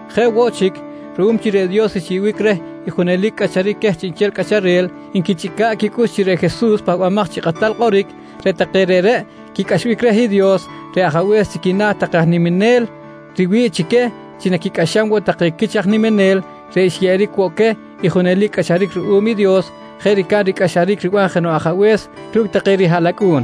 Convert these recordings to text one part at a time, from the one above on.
Jeꞌ woꞌ chic, ruꞌum chi reꞌ Dios xyeꞌbic reh i junelic cꞌacharic queh chiꞌnchel cꞌacharel nquichꞌica̱ꞌ quicꞌux chi reꞌ Jesus reꞌ Pahbamaj chi Kꞌatal Kꞌoric, reꞌ take reꞌreꞌ quicꞌaxbic reh i Dios reꞌ Ajabe̱s chi quina̱ take aj niminel riwi̱ꞌ chi queh chi naquicꞌaxam woꞌ take quich aj niminel reꞌ xyeꞌeric woꞌ queh i junelic cꞌacharic ruꞌum i Dios jeꞌ ricab ricꞌaxaric riban jenoꞌ ajabe̱s ru̱cꞌ take rihaꞌlacꞌu̱n.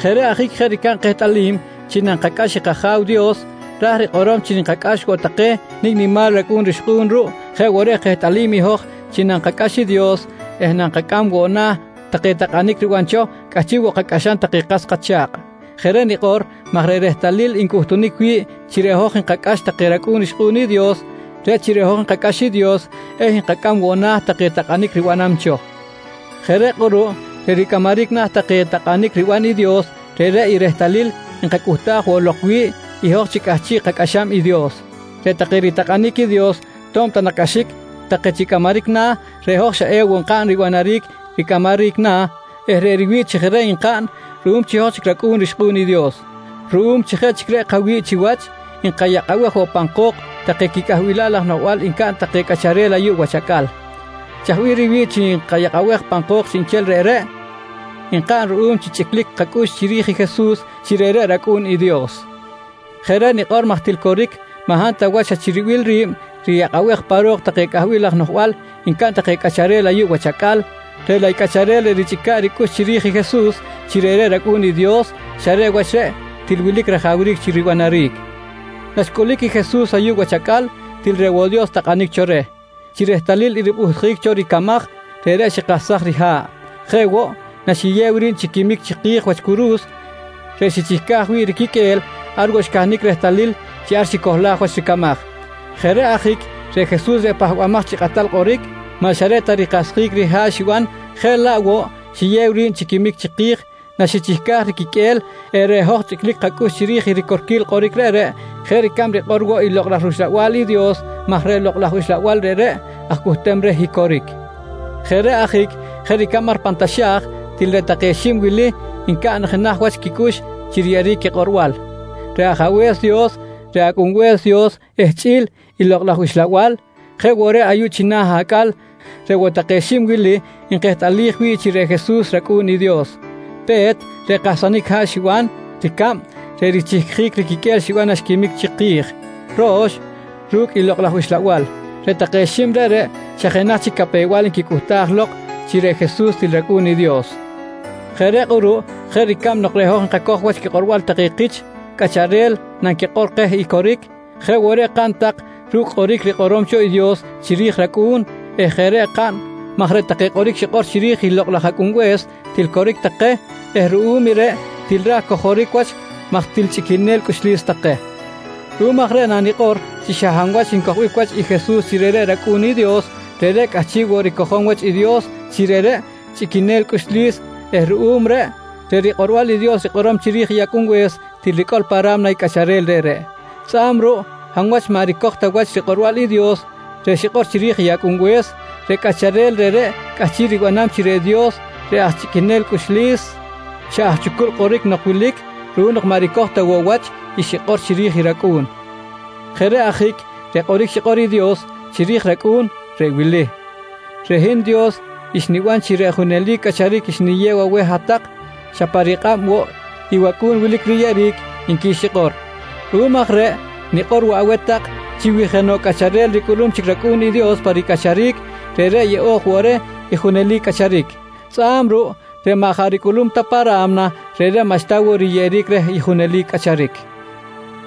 Jeꞌ reꞌ ajic jeꞌ ricab kehtꞌalim chi nankacꞌax i kAja̱w Dios ra̱j rikꞌorom chi nkacꞌax woꞌ take nicꞌ nimal racꞌu̱n rixkꞌu̱n ruꞌ, jeꞌ woꞌ reꞌ kehtꞌalim i hoj chi nankacꞌax i Dios eh nankacꞌam woꞌ na̱ take takꞌanic riban cho, cꞌahchiꞌ woꞌ kacꞌaxam take kas kacha̱kꞌ. Jeꞌ reꞌ nikꞌor maj reꞌ rehtalil ncꞌuhtunic wi̱ꞌ chi reꞌ hoj nkacꞌax take racꞌu̱n rixkꞌu̱n i Dios, reꞌ chi reꞌ hoj nkacꞌax i Dios eh nkacꞌam woꞌ na̱ take takꞌanic ribanam cho. Jeꞌ reꞌ kꞌuruꞌ reꞌ ricꞌamaric na̱ take takꞌanic riban i Dios, reꞌreꞌ i rehtalil nkacꞌuhtaj woꞌ lok wi̱ꞌ i hoj chi cꞌahchiꞌ kacꞌaxam i Dios. Reꞌ take ritakꞌanic i Dios to̱b ta nak cꞌaxic take chi cꞌamaric na̱, reꞌ hoj xa ewoꞌ nkaꞌn ribanaric ricꞌamaric na̱ eh reꞌ riwi̱ꞌ chi jeꞌ reꞌ nkaꞌn ruꞌum chi hoj chic racꞌu̱n rixkꞌu̱n i Dios. Ruꞌum chi jeꞌ chic reꞌ kawi̱ꞌ chiwach, nkayakꞌabej woꞌ pan ko̱k take quicꞌahbilal laj noꞌjbal ncaꞌn take cꞌacharel ayuꞌ wach acꞌal. Chaj bih riwi̱ꞌ chi nkayakꞌabej pan ko̱k chiꞌnchel reꞌreꞌ? Nkaꞌn ruꞌum chi chꞌiclic chic kacꞌux chiri̱j i Jesus chi reꞌreꞌ rAcꞌu̱n i Dios. Jeꞌ reꞌ nikꞌor maj til coric, maꞌ hab ta wach xa chi ribil ri̱b riyakꞌabej pa ro̱k take cꞌahbil laj noꞌjbal ncaꞌn take cꞌacharel ayuꞌ wach acꞌal, reꞌ laꞌ i cꞌacharel reꞌ richꞌica̱ꞌ ricꞌux chiri̱j i Jesus chi reꞌreꞌ rAcꞌu̱n i Dios xa reꞌ wach reꞌ til wilic rajawric chi ribanaric. Naxcꞌulic i Jesus ayuꞌ wach acꞌal, til reꞌ woꞌ Dios takꞌanic cho reh. Chi rehtalil i ripꞌuhtic cho i ricamaj, reꞌreꞌ xikahsaj riha̱ꞌ. Jeꞌ woꞌ, naxiyew ri̱b chi quimic chiki̱j wach curu̱s reꞌ xichihcaj wi̱ꞌ riquiqꞌue̱l ar woꞌ xcahnic rehtalil chi ar xicohlaj wach ricamaj. Jeꞌ reꞌ ajic reꞌ Jesus reꞌ Pahbamaj chi Kꞌatal Kꞌoric, maꞌ xa reꞌ ta rikahsjic riha̱ꞌ xiban jeꞌ laꞌ woꞌ xiyew ri̱b chi quimic chiki̱j naxichihcaj riquiqꞌue̱l eh reꞌ hoj chꞌiclic kacꞌux chiri̱j i ricorquil kꞌoric reꞌreꞌ jeꞌ ricab rikꞌor woꞌ i Lokꞌ laj rUxlabal i Dios maj reꞌ Lokꞌ laj Uxlabal reꞌreꞌ aj cꞌuhtem reh i coric. Jeꞌ reꞌ ajic, jeꞌ ricab ar pan taxa̱j til reꞌ take xib wili ncaꞌn jenaj wach quicꞌux chi riyeꞌjic quikꞌorbal: Reꞌ Ajabe̱s Dios, reꞌ Acꞌunbe̱s Dios eh chꞌi̱l i Lokꞌ laj Uxlabal, jeꞌ woꞌ reꞌ ayuꞌ china̱ acꞌal, reꞌ woꞌ take xib wili nkehtꞌalij wi̱ꞌ chi reꞌ Jesus rAcꞌu̱n i Dios: Pe̱t, reꞌ kahsanic haꞌ xiban. Ricab, reꞌ richihcjic riquiqꞌue̱l xiban naxquimic chiki̱j. Ro̱x, ru̱cꞌ i Lokꞌ laj Uxlabal. Reꞌ take xib reꞌreꞌ xa jenaj chi capew-bal nquicꞌuhtaj lok, chi reꞌ Jesus til rAcꞌu̱n i Dios. Jeꞌ reꞌ kꞌuruꞌ jeꞌ ricab nok reꞌ hoj nkacoj wach quikꞌorbal take kich cꞌacharel nanquikꞌor keh i coric, jeꞌ woꞌ reꞌ kaꞌn tak ru̱cꞌ kꞌoric rikꞌorom cho i Dios chiri̱j i rAcꞌu̱n eh jeꞌ reꞌ kaꞌn maj reꞌ take kꞌoric xikꞌor chiri̱j i Lokꞌ laj Acꞌunbe̱s til coric take eh ruꞌum i reꞌ til raj cojoric wach maj til chꞌiquenel cꞌuxlis take. Ruꞌum aj reꞌ nanikꞌor chi xa hab wach ncojbic wach i Jesus chi reꞌreꞌ rAcꞌu̱n i Dios, reꞌreꞌ cꞌahchiꞌ woꞌ ricojom wach i Dios chi reꞌreꞌ chꞌiquenel cꞌuxlis eh ruꞌum reꞌ, reꞌ rikꞌorbal i Dios rikꞌorom chiri̱j i Acꞌunbe̱s til ricꞌol pa ra̱mna i cꞌacharel reꞌreꞌ. Tzꞌa̱b ruꞌ hab wach maꞌ ricoj ta wach rikꞌorbal i Dios reꞌ xikꞌor chiri̱j i Acꞌunbe̱s, reꞌ cꞌacharel reꞌreꞌ cꞌahchiꞌ ribanam chi reꞌ Dios reꞌ aj chꞌiquenel cꞌuxlis, xa aj chucul kꞌoric nok wilic ruꞌum nok maꞌ ricoj ta woꞌ wach i xikꞌor chiri̱j i rAcꞌu̱n. Jeꞌ reꞌ ajic reꞌ kꞌoric xikꞌor i Dios chiri̱j i rAcꞌu̱n, reꞌ wili: “Reꞌ hin Dios xniban chi reꞌ junelic cꞌacharic xniyew aweh hat-tak, xa pa rikꞌab woꞌ i wAcꞌu̱n wilic riyeꞌeric, nqui xikꞌor. Ruꞌum aj reꞌ nikꞌor woꞌ aweh tak chi wi jenoꞌ cꞌacharel ricꞌulum chic rAcꞌu̱n i Dios pa ricꞌacharic, reꞌreꞌ yeꞌo̱j woꞌ reh i junelic cꞌacharic. Tzꞌa̱b ruꞌ reꞌ maꞌ jaꞌ ricꞌulum ta pa ra̱mna, reꞌreꞌ maꞌxta woꞌ riyeꞌeric reh i junelic cꞌacharic.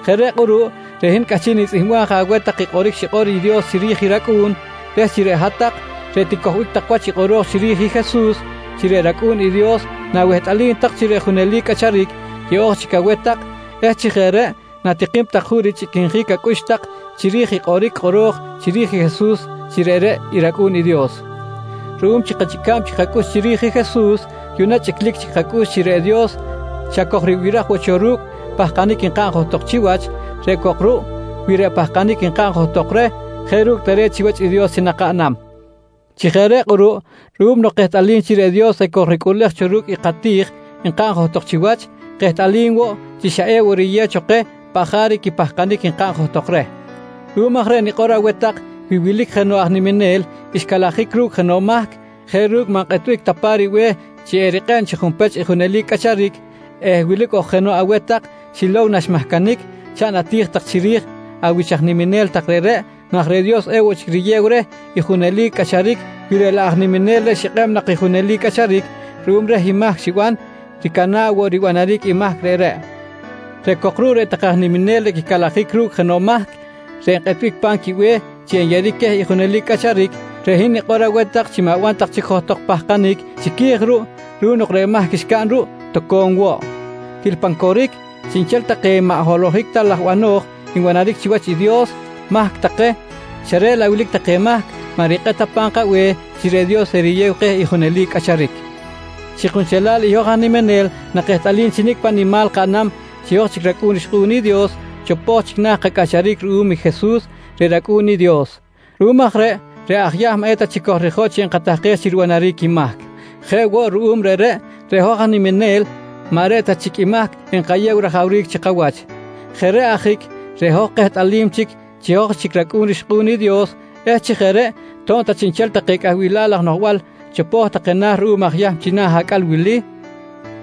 Jeꞌ reꞌ kꞌuruꞌ reꞌ hin cꞌahchiꞌ nitzꞌihmbam je aweh tak i kꞌoric xikꞌor i Dios chiri̱j i rAcꞌu̱n reh chi reꞌ hat-tak reꞌ ticojbic tak wach i kꞌoro̱j chiri̱j i Jesus chi reꞌreꞌ rAcꞌu̱n i Dios na̱wehtꞌalim tak chi reꞌ junelic cꞌacharic yeꞌo̱j chic aweh tak eh chi jeꞌ reꞌ na̱tikim tak juꞌ richꞌiquinjic acꞌux tak chiri̱j i kꞌoric kꞌoro̱j chiri̱j i Jesus chi reꞌreꞌ i rAcꞌu̱n i Dios. Ruꞌum chi kachꞌica̱b chic kacꞌux chiri̱j i Jesus yuꞌna chꞌiclic chic kacꞌux chi reꞌ Dios xa kojribiraj woꞌ cho ru̱cꞌ kapahkanic nkaꞌn johtok chiwach, reꞌ cok ruꞌ wi reꞌ pahkanic nkaꞌn johtok reh jeꞌ ru̱cꞌ tare̱t chiwach i Dios chi nakaꞌnam. Chi jeꞌ reꞌ kꞌuruꞌ ruꞌum nok kehtꞌalim chi reꞌ Dios ekojricꞌuꞌlej cho ru̱cꞌ kati̱j nkaꞌn johtok chiwach, kehtꞌalim woꞌ chi xa ewoꞌ riyew cho keh paꞌ jaric i kapahkanic nkaꞌn johtok reh. Ruꞌum aj reꞌ nikꞌor aweh tak wi wilic jenoꞌ aj niminel xcalajic ru̱cꞌ jenoꞌ mahc jeꞌ ru̱cꞌ maꞌ nkꞌetbic ta pa̱m ribe̱h chi erikꞌeb chi junpech i junelic cꞌacharic eh wilic ok jenoꞌ aweh tak xilow naxmahcanic, chaꞌn ati̱j tak chiri̱j awich aj niminel tak reꞌreꞌ maj reꞌ Dios ewoꞌ chic riyew reh i junelic cꞌacharic wi laꞌ reꞌ aj niminel reꞌ xikꞌeb nak i junelic cꞌacharic ruꞌum reh i mahc xiban, ricana̱ꞌ woꞌ ribanaric i mahc reꞌreꞌ. Reꞌ cok ruꞌ reꞌ take aj niminel reꞌ quicalajic ru̱cꞌ jenoꞌ mahc reꞌ nkꞌetbic pa̱m quibe̱h chi enyeꞌeric queh i junelic cꞌacharic, reꞌ hin nikꞌor aweh tak chi ma̱ban tak chic johtok pahkanic chiqui̱j ruꞌ, ruꞌum nok reꞌ mahc xcaꞌn ruꞌ toco̱m woꞌ. Til pan coric, chiꞌnchel take maꞌ holohic ta laj bano̱j nbanaric chiwach i Dios, mahc take, xa reꞌ laꞌ wilic take mahc maꞌ rikꞌet ta pa̱m kabe̱h chi reꞌ Dios eriyew keh i junelic cꞌacharic. Chi kunchelal i hoj aj niminel nakehtꞌalim chi nicꞌ paꞌ nimal kaꞌnam chi hoj chic racꞌu̱n rixkꞌu̱n i Dios, chopo̱j chic na̱ kacꞌacharic ruꞌum i Jesus reꞌ rAcꞌu̱n i Dios. Ruꞌum aj reꞌ, reꞌ aj Yahm maꞌ eta chic kojrijotꞌ chi enkatahkej chi ribanaric i mahc. Jeꞌ woꞌ ruꞌum reꞌreꞌ, reꞌ hoj aj niminel maꞌ reꞌ ta chic i mahc enkayew rajawric chi kawach. Jeꞌ reꞌ ajic reꞌ hoj kehtꞌalim chic chi hoj chic racꞌu̱n rixkꞌu̱n i Dios eh chi jeꞌ reꞌ to̱b ta chiꞌnchel take cꞌahbilal laj noꞌjbal chopo̱j take na̱ ruꞌum aj Yahm china̱ acꞌal wili,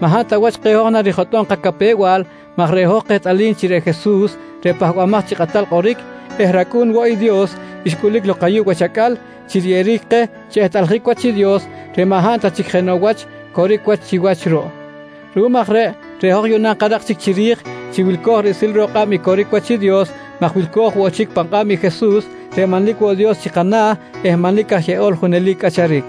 maꞌ hab ta wach keh hoj narijotꞌom kacapew-bal maj reꞌ hoj kehtꞌalim chi reꞌ Jesus reꞌ Pahbamaj chi Kꞌatal Kꞌoric eh rAcꞌu̱n woꞌ i Dios, xcꞌulic lok ayuꞌ wach acꞌal chi riyeꞌeric keh chi ehtꞌaljic wach i Dios reꞌ maꞌ hab ta chic jenoꞌ wach coric wach chiwach ruꞌ. Ruꞌum aj reꞌ, reꞌ hoj yuꞌna nkarak chic chiri̱j chi wilco̱j riꞌsil ro̱k kꞌab i coric wach Dios maj wilco̱j woꞌ chic pan kꞌab i Jesus reꞌ manlic woꞌ Dios chi kana̱ eh manlic aj Yeꞌol Junelic Cꞌacharic.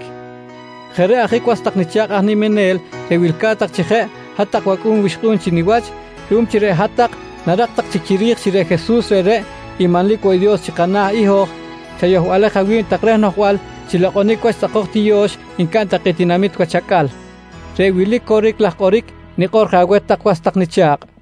Jeꞌ reꞌ ajic was tak nicha̱kꞌ aj niminel reꞌ wilca̱t tak chi jeꞌ hat-tak wacꞌu̱n wixkꞌu̱n chi niwach, ruꞌum chi reꞌ hat-tak narak tak chic chiri̱j chi reꞌ Jesus reꞌreꞌ i manlic woꞌ Dios chi kana̱ i hoj, chayohbalej awi̱b tak reh noꞌjbal chi lokꞌonic wach tzꞌakoj tiyo̱x ncaꞌn take tinamit wach acꞌal. Reꞌ wili coric laj kꞌoric nikꞌor je aweh tak was tak nicha̱kꞌ.